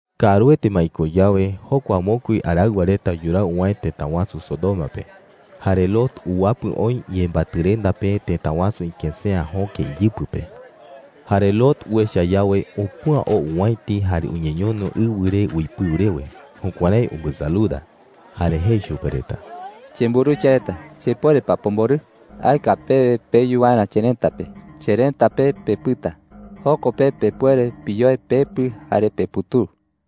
Kaaruete ma iko yawe, jokua mokui araɨwa reta yuraa uwäe tëta wasu Sodoma pe. Jare Lot uwapɨ oï yembatɨrenda pe tëta wasu ikësea jöke iyɨpɨ pe. Jare Lot uecha yawe, upüa oo owäiti jare uñeñono ɨwɨ re uipɨu rewe. Jukuärái umbɨsaluda. Jare jei chupe reta: “Chemburuwicha reta, ¿chepuere pa pomborɨ? Aeka pewe peyu waerä cherëta pe. Cherëta pe pepɨta. Joko pe pepuere piyoe pepɨ jare peputuu.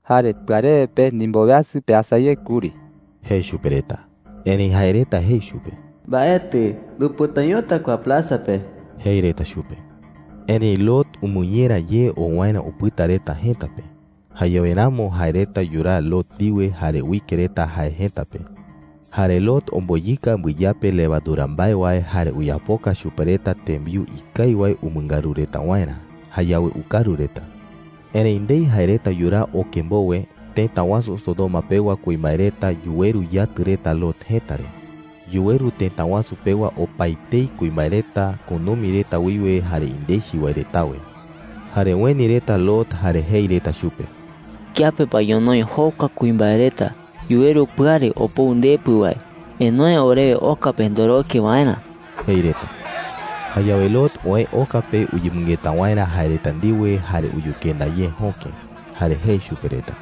Jare pɨarewe pe ndimboweasɨ peasa ye kuri,” jei chupe reta. Erëi jae reta jei chupe: “Mbaetɨ. Ndupɨtañota kua plaza pe,” jei reta chupe. Erëi Lot umɨñera ye oo waerä upɨta reta jëta pe. Jayawe ramo jae reta yuraa Lot ndiwe jare uike reta jae jëta pe. Jare Lot omboyɨka mbɨyape levadura mbae wae jare uyapoka chupe reta tembiu jëe ngatu wae umɨngaru reta waerä. Jayawe ukaru reta. Erëi ndei jae reta yuraa oke mbowe, tëta wasu Sodoma pewa kuimbae reta yuweru yatɨ reta Lot jëta re. Yuweru tëta wasu pewa opaetei kuimbae reta, kunumi reta wiwe jare indechi wae retawe. Jare ueni reta Lot jare jei reta chupe: “¿Kiape pa ñonoï jokua kuimbae reta yuweru pɨare opou ndepɨ wae? ¡Enoe orewe oka pe ndoroke waerä!” jei reta. Jayawe Lot oë oka pe uyemɨngeta waerä jae reta ndiwe jare uyukenda ye jöke. Jare jei chupe reta: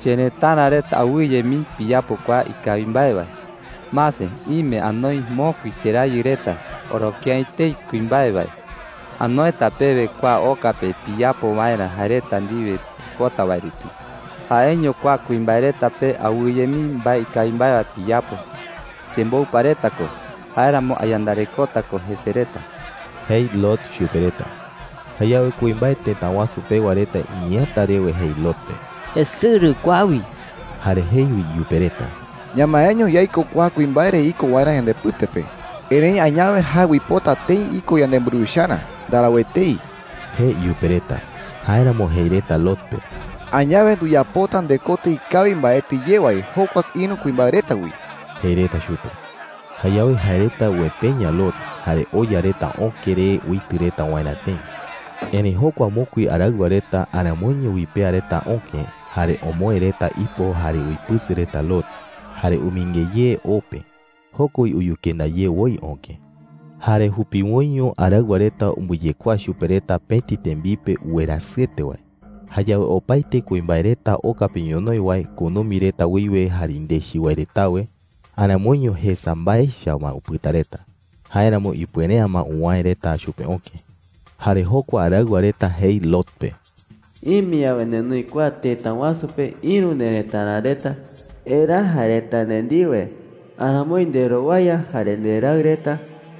“Cherëtara reta, awɨye mii piyapo kua ikawi mbae wae. Mase, ime anoi mokui cherayɨ reta oroke’ä etei kuimbae wae. Anoeta pewe kua oka pe piyapo waerä jae reta ndiwe pipota wae rupi. Jaeño kua kuimbae reta pe awɨye mii mbae ikawi mbae wae piyapo. Chemboupa reta ko; jáeramo ayandarekota ko jese reta,” jei Lot chupe reta. Jayawe kuimbae tëta wasu pewa reta iñeeäta rewe jei Lot pe: “¡Esɨrɨ kua wi!” Jare jei wi iyupe reta: “Ñamaeño yaiko kua kuimbae re iko waerä yandepɨte pe, erëi añawe jae uipota tëi iko yanemburuwicharä. ¡Ndarau etei!” jei iyupe reta. Jáeramo jei reta Lot pe: “¡Añawe nduyapota ndekotɨ ikawi mbaete ye wae jokua ïru kuimbae reta wi!” jei reta chupe. Jayawe jae reta uepeña Lot, jare oya reta öke re uitɨ reta waerä tëi. Erëi jokua mokui araɨwa reta aramoiño uipea reta öke. Jare omoë reta ipo jare uipɨsɨ reta Lot, jare umɨinge ye o pe. Joko wi uyukenda ye woi öke. Jare jupiwoiño araɨwa reta umbɨyekuaa chupe reta pëti tembipe uwerasɨete wae. Jayawe opaete kuimbae reta oka pe ñonoï wae, kunumi reta wiwe jare indechi wae retawe, aramoiño jesa mbae echa ma upɨta reta. Jáeramo ipuere’ä ma uwäe reta chupe öke. Jare jokua araɨwa reta jei Lot pe: “Ime yawe nenoi kua tëta wasu pe ïru nerëtara reta, eraa jae reta nde ndiwe. Aramoi nderowaya jare nderaɨ reta,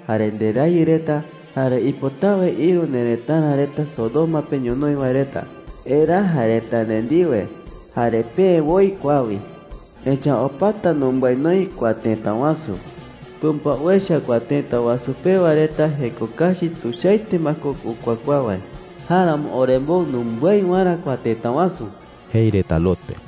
jare nderayɨ reta, jare ipotawe ïru nerëtara reta Sodoma pe ñonoï wae reta, eraa jae reta nde ndiwe jare peë woi kua wi. Echa’ä opata numbái noï kua tëta wasu. Tumpa uecha kua tëta wasu pewa reta jeko kachi tuichaete ma ko ukuakuaa wae. Jáeramo orembou numbái waerä kua tëta wasu,” jei reta Lot pe.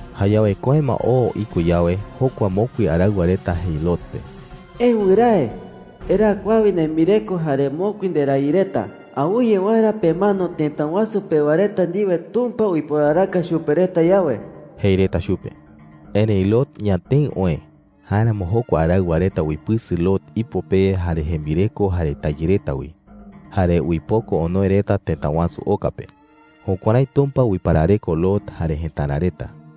Jayawe köe ma oo iko yawe, jokua mokui araɨwa reta jei Lot pe: “¡Eë wɨrae! Eraa kua wi nembireko jare mokui nderayɨ reta, awɨye waerä pemano tëta wasu pewa reta ndiwe Tumpa uiporaraka chupe reta yawe,” jei reta chupe. Erëi Lot ñatëɨ oë. Jáeramo jokua araɨwa reta uipɨsɨ Lot ipo pe jare jembireko jare tayɨ reta wi, jare uipoko onoe reta tëta wasu oka pe. Jukuärái Tumpa uiparareko Lot jare jëtara reta.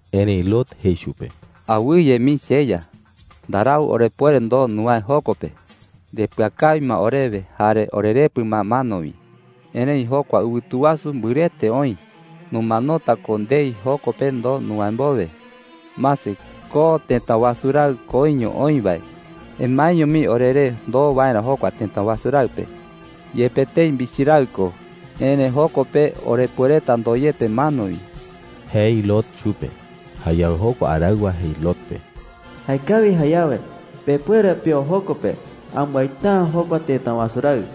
Erëi Lot jei chupe: “¡Awɨye mii, cheya!” jei. “Ndarau orepuere ndoo nuwäe joko pe. Ndepɨakawi ma orewe jare orerepɨ ma mano wi. Erëi jokua ɨwɨtu wasu mbɨrɨete oï. Numanota ko ndei joko pe ndoo nuwäe mbowe,” jei. “Mase, ko tëta wasu raɨ koiño oï wae. Emaeño mii oreré ndoo waerä jokua tëta wasu raɨ pe. Yepe tëi michi raɨ ko, erëi joko pe orepuereta ndoyepe mano wi,” jei Lot chupe. Jayawe jokua araɨwa jei Lot pe: “Jaekawi jayawe, pepuere peo joko pe. Ambaita’ä jokua tëta wasu raɨ.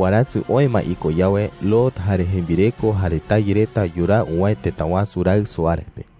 Warasɨ oë ma iko yawe, Lot jare jembireko jare tayɨ reta yuraa uwäe tëta wasu raɨ Soar pe.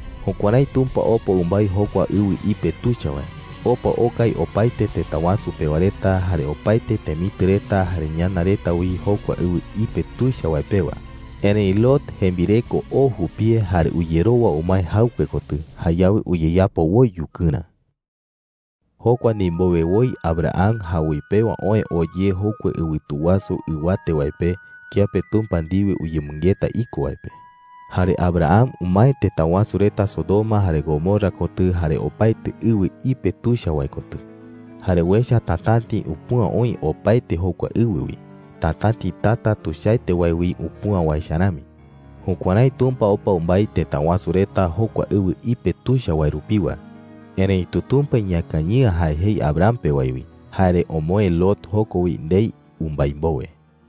Jukuärái Tumpa opa umbái jokua ɨwɨ ipe tuicha wae. Opa okai opaete tëta wasu pewa reta, jare opaete temitɨ reta jare ñana reta wi jokua ɨwɨ ipe tuicha wae pewa. Erëi Lot jembireko oo jupie jare uyerowa umae jaɨkue kotɨ. Jayawe uyeyapo woi yukɨrä. Jokua ndimbowe woi Abraham jawoi pewa oë oo ye jokua ɨwɨtu wasu ɨwate wae pe, kiape Tumpa ndiwe uyemɨngeta iko wae pe. Jare Abraham umae tëta wasu reta Sodoma jare Gomorra kotɨ jare opaete ɨwɨ ipe tuicha wae kotɨ. Jare uecha tatäti upüa oï opaete jokua ɨwɨ wi, tatäti tata tuichaete wae wi upüa wae echa rami. Jukuärái Tumpa opa umbái tëta wasu reta jokua ɨwɨ ipe tuicha wae rupiwa. Erëitu Tumpa iñakañɨ'ä jae jei Abraham pe wae wi, jare omoë Lot joko wi ndei umbái mbowe.